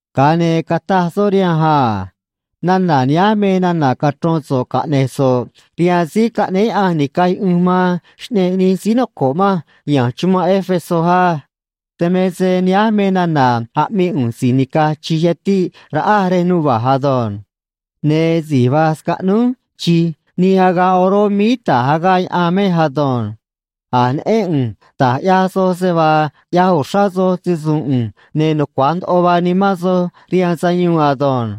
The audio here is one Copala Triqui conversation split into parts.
Ga̱a ne̱ cataj soꞌ rihanj a: ―Nana̱ nihánj me nana̱ cachro̱n so̱ꞌ caꞌne̱j so̱ꞌ rihaan síí caꞌnéé Yaꞌanj ni̱caj yuꞌunj man xꞌneꞌ nij síí noco̱ꞌ manj ya̱nj chumanꞌ Éfeso á: “Dan me se nihánj me nana̱ aꞌmii ꞌu̱nj si̱j nica̱j chi̱j yatiꞌ raꞌa rej nuva̱ꞌ ado̱nj. Ne̱ si̱j va̱j scaꞌnúj chi̱j nij agaꞌ oró míí ta̱j agaꞌ yaꞌan mej ado̱nj. A̱j neꞌén ꞌu̱nj da̱j ꞌyaj soj se vaa ꞌyaj uxrá soj se‑su̱u̱n ꞌu̱nj ne̱ nucua̱j ndoꞌo vaa nimán soj rihaan sayuun ado̱nj.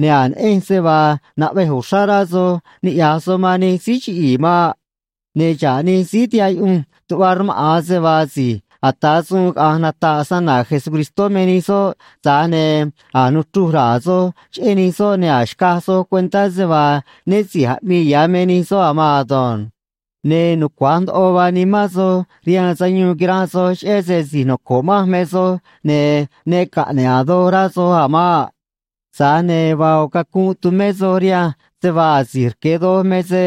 Ne̱ a̱j neꞌenj se vaa naꞌvej uxrá rá soj ni̱ꞌyaj soj man nij síí chiꞌi̱i̱ maꞌ. Ne̱ xa̱ꞌ nij síí tihaꞌ yuꞌunj tuꞌva rmaꞌa̱n se vaa si̱j ata̱ suun caꞌa̱nj nata̱ꞌ snana̱ Jesucristó me nij soꞌ, tza̱j ne̱ a̱j nuchruj ra̱a̱ soj cheꞌé nij soꞌ, ne̱ a̱j xcaj soj cuentá se vaa né si̱j aꞌmii ya̱ me nij soꞌ a̱ maan ado̱nj. Ne̱ nucua̱j ndoꞌo vaa nimán soj rihaan sayuun quiranꞌ soj cheꞌé se si̱j noco̱ꞌ manj me soj, ne̱ ne caꞌne̱ꞌ a̱ doj rá soj a̱ maꞌ. Tza̱j ne̱ vaa ꞌo̱ cacunꞌ tumé soj rihanj se vaa asi̱j rque̱ doj me se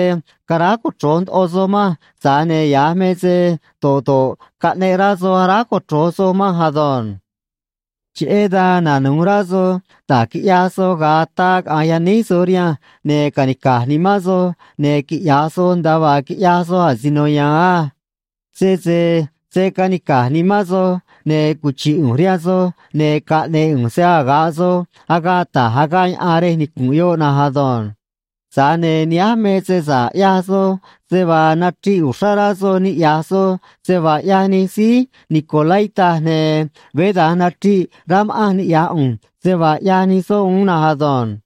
caráj cochro̱j ndoꞌo soj manj, tza̱j ne̱ ya̱j me se do̱ꞌ do̱ꞌ caꞌneꞌ rá soj aráj cochro̱j soj manj ado̱nj. ’Cheꞌé dan nanu̱j rá soj da̱j quiꞌyaj soj ga̱a ataa caꞌa̱nj yaníj soj rihanj, ne̱ ca̱nica̱j nimán soj, ne̱ quiꞌya̱j soj nda̱a vaa quiꞌyaj soj asino ya̱a̱n á. Sese se̱ canica̱j nimán soj, ne̱ cuchi̱ꞌ ꞌu̱nj rihaan soj, ne̱ caꞌne̱e̱ ꞌu̱nj se‑aga̱ꞌ soj agaꞌ ta̱j agaꞌ yaꞌan rej nicu̱nꞌ yoꞌ na̱nj ado̱nj. Tza̱j ne̱ nihánj me se sa̱ꞌ ꞌyaj soj, se vaa nachriꞌ uxrá rá soj niꞌya̱j soj se vaa ꞌyaj nij síí nicolaíta, ne̱ veé da̱nj nachriꞌ rá ma̱ꞌanj niꞌya̱j ꞌu̱nj se vaa ꞌyaj nij soꞌ uún na̱nj ado̱nj.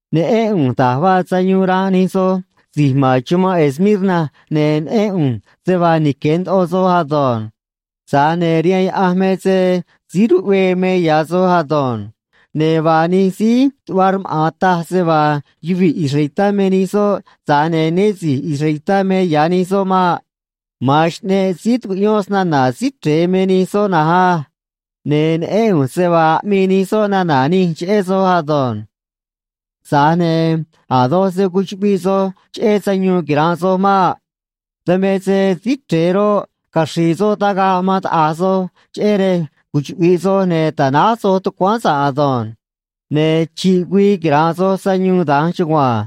Neꞌén ꞌu̱nj da̱j vaa sayuun ranꞌ nij soj si̱j ma̱n chumanꞌ Esmirna, ne̱ neꞌén ꞌu̱nj se vaa nique̱ ndoꞌo soj ado̱nj. Tza̱j ne̱ rihaan Yaꞌanj me se síí ruꞌvee me ya̱ soj ado̱nj. Ne̱ vaa nij síí tuꞌva rmaꞌa̱n taj se vaa yuvii̱ israelitá me nij soꞌ, tza̱j ne̱ né si̱j israelitá me ya̱ nij soꞌ maꞌ. Ma̱an xꞌneꞌ síí tucuꞌyón snana̱ Síí Chre̱e me nij soꞌ na̱nj á. Ne̱ neꞌén ꞌu̱nj se vaa aꞌmii nij soꞌ nana̱ nij cheꞌé soj ado̱nj. ’Tza̱j ne̱ a̱ doj se̱ cuchuꞌviꞌ soj cheꞌé sayuun quira̱nꞌ soj maꞌ. Dan me se Síí Chre̱e roꞌ, caxri̱i̱ soꞌ tagaꞌ man taꞌa̱j soj, cheꞌé rej cuchuꞌvi̱ꞌ soj ne̱ ta̱náj soj tucuáán sa̱ꞌ ado̱nj. Ne̱ chi̱ꞌ güii quira̱nꞌ soj sayuun da̱nj chugua̱nj.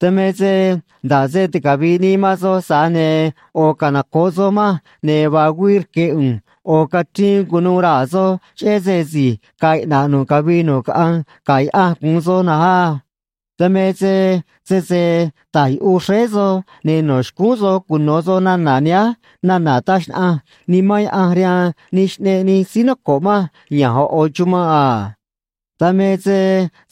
Dan me se nda̱ꞌ se ticavi̱ꞌ nii man soj, tza̱j ne̱ ꞌo̱ canoco̱ꞌ soj manj, ne̱ vaa güii rque̱ ꞌu̱nj ꞌo̱ cachriin cu̱nuû raa̱ soj, cheꞌé se si̱j ga̱a̱ iꞌna̱ꞌ nu̱ꞌ cavii nu̱ꞌ caꞌanj ga̱ Yaꞌanj gu̱un soj na̱nj á. Dan me se sese ta̱j yuꞌuj xréé soj, ne̱ no̱ xcúún soj cuno̱ soj nana̱ nihánj nana̱ taj xnaꞌanj Nimán Yaꞌanj rihaan nij xꞌneꞌ nij síí noco̱ꞌ manj ya̱nj ꞌo̱ ꞌo̱ chumanꞌ a. Dan me se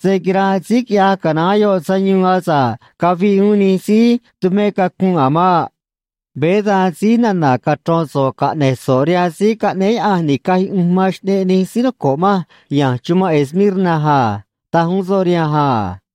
se̱ quiranꞌ síí quiꞌya̱j canaán yoꞌ sayuun asa̱ꞌ caviꞌ uún nij síí tumé cacunꞌ a̱ maꞌ.” Veé da̱nj síj nana̱ cachro̱n so̱ꞌ caꞌne̱j so̱ꞌ rihaan síí caꞌnéé Yaꞌanj ni̱caj yuꞌunj man xꞌneꞌ nij síí noco̱ꞌ manj ya̱nj chumanꞌ Esmirna a ―taj uún soꞌ rihanj a.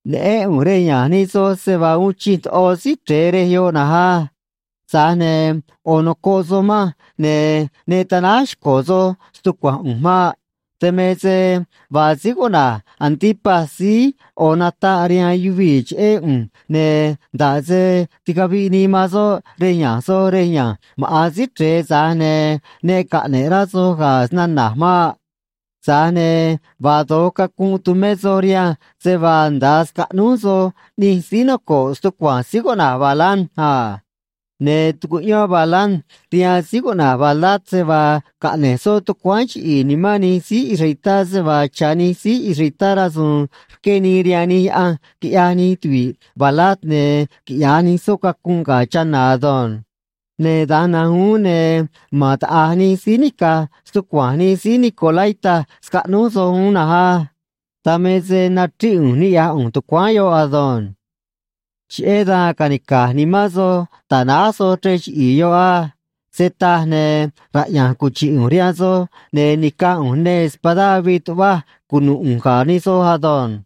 Neꞌén ꞌu̱nj rej ya̱nj nij soj, se vaa uun chij ndoꞌo Síí Chre̱e rej yoꞌ na̱nj á. Tza̱j ne̱ ꞌo̱ nocoꞌ soj manj, ne̱ ne ta̱náj xco̱ soj stucua̱nj ꞌu̱nj maꞌ. Dan me se vaa síí cuꞌna̱j Antipas síí ꞌo̱ nataꞌ rihaan yuvii̱ cheꞌé ꞌu̱nj, ne̱ nda̱ꞌ se ticaviꞌ nii man soꞌ rej ya̱nj soj rej ya̱nj maꞌa̱n Síí Chre̱e, tza̱j ne̱ ne caꞌne̱ꞌ rá soj ga̱ snana̱j maꞌ. Tza̱j ne̱ vaa do̱j cacunꞌ tumé soj rihanj, se vaa nda̱a scaꞌnúj soj ꞌnij síí noco̱ꞌ stucua̱nj síí cuꞌna̱j Balaam a. Ne̱ tucuꞌyón Balaam rihaan síí cuꞌna̱j Balac se vaa caꞌne̱j soꞌ tucuáán chiꞌi̱i̱ nimán nij síí israelitá se vaa cha̱ nij síí israelitá rasu̱u̱n rqué nii rihaan nij yaꞌanj quiꞌyaj nij tuvi̱ꞌ Balac ne̱ quiꞌya̱j nij soꞌ cacunꞌ ga̱ chana̱ ado̱nj. Ne̱ da̱nj na̱nj uún, ne̱ ma̱n taꞌa̱j nij síí nica̱j stucua̱nj nij síí nicolaíta scaꞌnúj soj uún na̱nj á. Dan me se nachríꞌ ꞌu̱nj niꞌya̱j ꞌu̱nj tucuáán yoꞌ ado̱nj. ’Cheꞌé dan ca̱nica̱j nimán soj, ta̱náj soj chrej chiꞌi̱i̱ yoꞌ á. Se taj, ne̱ raꞌya̱nj cuchi̱ꞌ ꞌu̱nj rihaan soj, ne̱ ni̱caj ꞌu̱nj neê espadá avii tuꞌvaj cunu̱ꞌ ꞌu̱nj ga̱ nij soj ado̱nj.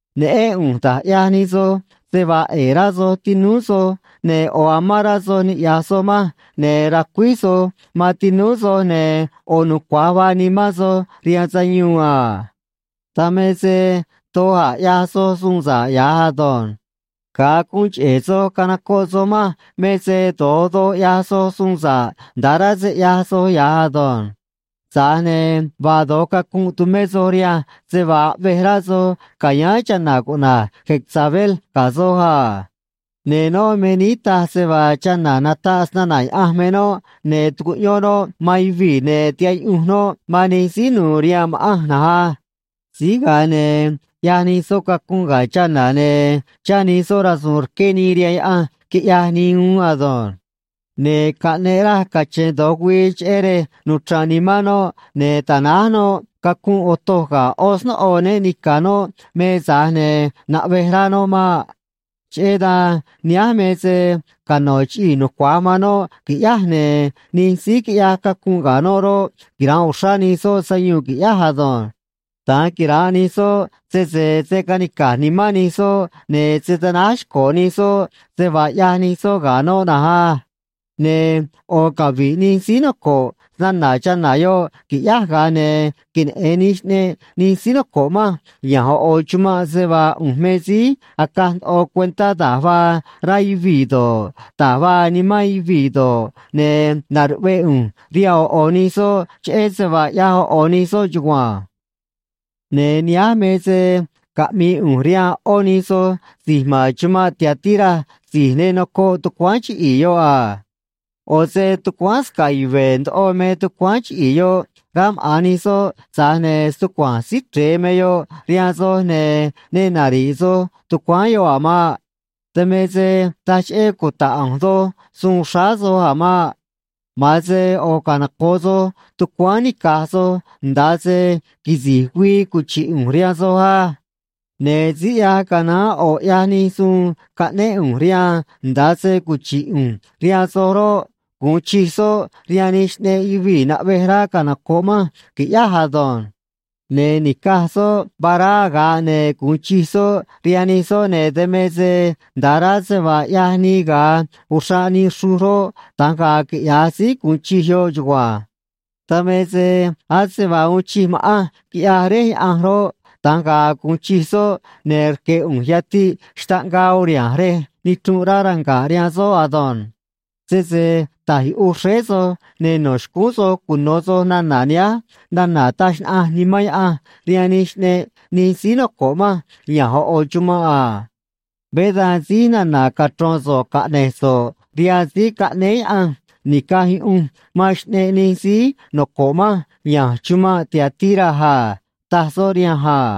Neꞌén ꞌu̱nj da̱j ꞌyaj nij soj se vaa ꞌe̱e̱ rá soj tinúú soj ne̱ ꞌo̱ amán rá soj niꞌya̱j soj manj ne̱ racuíj soj man tinúú soj ne̱ ꞌo̱ nucua̱j vaa nimán soj rihaan sayuun a. Dan me se doj a̱ ꞌyaj soj suun sa̱ꞌ ya̱j ado̱nj. Ga̱a guun cheꞌe̱ soj canocoꞌ soj manj me se do̱j doj ꞌyaj soj suun sa̱ꞌ nda̱ꞌ rá se ꞌyaj soj ya̱j ado̱nj. Tza̱j ne̱ vaa do̱j cacunꞌ tumé soj rihanj se vaa aꞌvej rá soj ca̱yáán chana̱ cuꞌna̱j Jezabel ga̱ soj a. Ne̱ noꞌ me níí taj se vaa chana̱ nataꞌ snana̱ Yaꞌanj me noꞌ, ne̱ tucuꞌyón noꞌ man yuvii̱, ne̱ tihaꞌ yuꞌunj noꞌ man nij síí nu̱u̱ rihaan ma̱ꞌanj na̱nj á. Síj ga̱a ne̱ ꞌyaj nij soꞌ cacunꞌ ga̱ chana̱ ne̱ chá nij soꞌ rasu̱u̱n rqué nii rihaan yaꞌanj quiꞌyaj nii uún ado̱nj. Ne̱ caꞌneꞌ raj cache̱n do̱j güii cheꞌé rej nuchra̱nꞌ nimán noꞌ ne̱ ta̱náj noꞌ cacunꞌ otoj ga̱ ꞌó snóꞌo né ni̱ca̱ noꞌ me, tza̱j ne̱ naꞌvej rá noꞌ maꞌ. Cheꞌé dan nihánj me se cano̱ chiꞌii̱ nucua̱j man noꞌ qui̱ꞌyáj, ne̱ nij síí quiꞌyaj cacunꞌ ga̱ noꞌ roꞌ, quira̱nꞌ uxrá nij soꞌ sayuun qui̱ꞌyáj ado̱nj. Da̱nj quira̱nꞌ nij soꞌ sese se̱ canica̱j nimán nij soꞌ ne̱ se̱ tanáj xco̱ nij soꞌ se vaa ꞌyaj nij soꞌ ga̱ noꞌ na̱nj á. Ne̱ ꞌo̱ cavi̱ꞌ nij síí noco̱ꞌ snana̱ chana̱ yoꞌ, qui̱ꞌyáj, ga̱a ne̱ queneꞌe̱n nij xꞌneꞌ nij síí noco̱ꞌ manj ya̱nj ꞌo̱ ꞌo̱ chumanꞌ se vaa ꞌu̱nj me síí acaj ndoꞌo cuentá da̱j vaa raa̱ yuvii̱ do̱ꞌ, da̱j vaa nimán yuvii̱ do̱ꞌ, ne̱ na̱ruꞌvee ꞌu̱nj rihaan ꞌo̱ ꞌo̱ nij soj cheꞌé se vaa ꞌyaj ꞌo̱ ꞌo̱ nij soj chugua̱nj. ’Ne̱ nihánj me se caꞌmi̱i̱ ꞌu̱nj rihaan ꞌó nij soj si̱j ma̱n chumanꞌ Tiatira si̱j ne nocoꞌ tucuáán chiꞌi̱i̱ yoꞌ a. ꞌO̱ se tucuáán sca̱ꞌ yuve̱ ndoꞌo me tucuáán chiꞌi̱i̱ yoꞌ, rá maꞌa̱n nij soꞌ, tza̱j ne̱ stucua̱nj Síí Chre̱e me yoꞌ rihaan soj, ne̱ ne nari̱ꞌ soj tucuáán yoꞌ a̱ maꞌ. Dan me se taj cheꞌé cuta̱ꞌ ꞌu̱nj doj suun xráá soj a̱ maꞌ. Ma̱an se ꞌo̱ canoco̱ꞌ soj tucuáán nica̱j soj nda̱a se quisi̱j güii cuchi̱ꞌ ꞌu̱nj rihaan soj á. Ne̱ síí ꞌyaj canaán ꞌo̱ ꞌyaj nij suun caꞌnéꞌ ꞌu̱nj rihaan nda̱a se cuchi̱ꞌ ꞌu̱nj rihaan soj roꞌ, gu̱un chij soꞌ rihaan nij xꞌneꞌ yuvii̱ naꞌvej rá canoco̱ꞌ manj, qui̱ꞌyáj ado̱nj. Ne̱ ni̱caj soꞌ vará aga̱ꞌ, ne̱ gu̱un chij soꞌ rihaan nij soꞌ, ne̱ dan me se nda̱a rá se vaa ꞌyaj nii ga̱a uxraꞌ nii xruj roꞌ, da̱nj ga̱a̱ quiꞌya̱j síí gu̱un chij yoꞌ chugua̱nj. Dan me se ase vaa uun chij ma̱ꞌanj quiꞌyaj Réj Yaꞌanj roꞌ, da̱nj ga̱a̱ gu̱un chij soꞌ, ne̱ rque̱ ꞌu̱nj yatiꞌ xtaꞌngaa uriha̱nj rej nichrunꞌ rá ranga̱ꞌ rihaan soꞌ ado̱nj. Sese ta̱j yuꞌuj xréé soj, ne̱ no̱ xcúún soj cuno̱ soj nana̱ nihánj nana̱ taj xnaꞌanj Nimán Yaꞌanj rihaan nij xꞌneꞌ nij síí noco̱ꞌ manj ya̱nj ꞌo̱ ꞌo̱ chumanꞌ a.” Veé da̱nj síj nana̱ cachro̱n so̱ꞌ caꞌne̱j so̱ꞌ rihaan síí caꞌnéé Yaꞌanj ni̱caj yuꞌunj man xꞌneꞌ nij síí noco̱ꞌ manj ya̱nj chumanꞌ Tiatira a ―taj soꞌ rihanj a.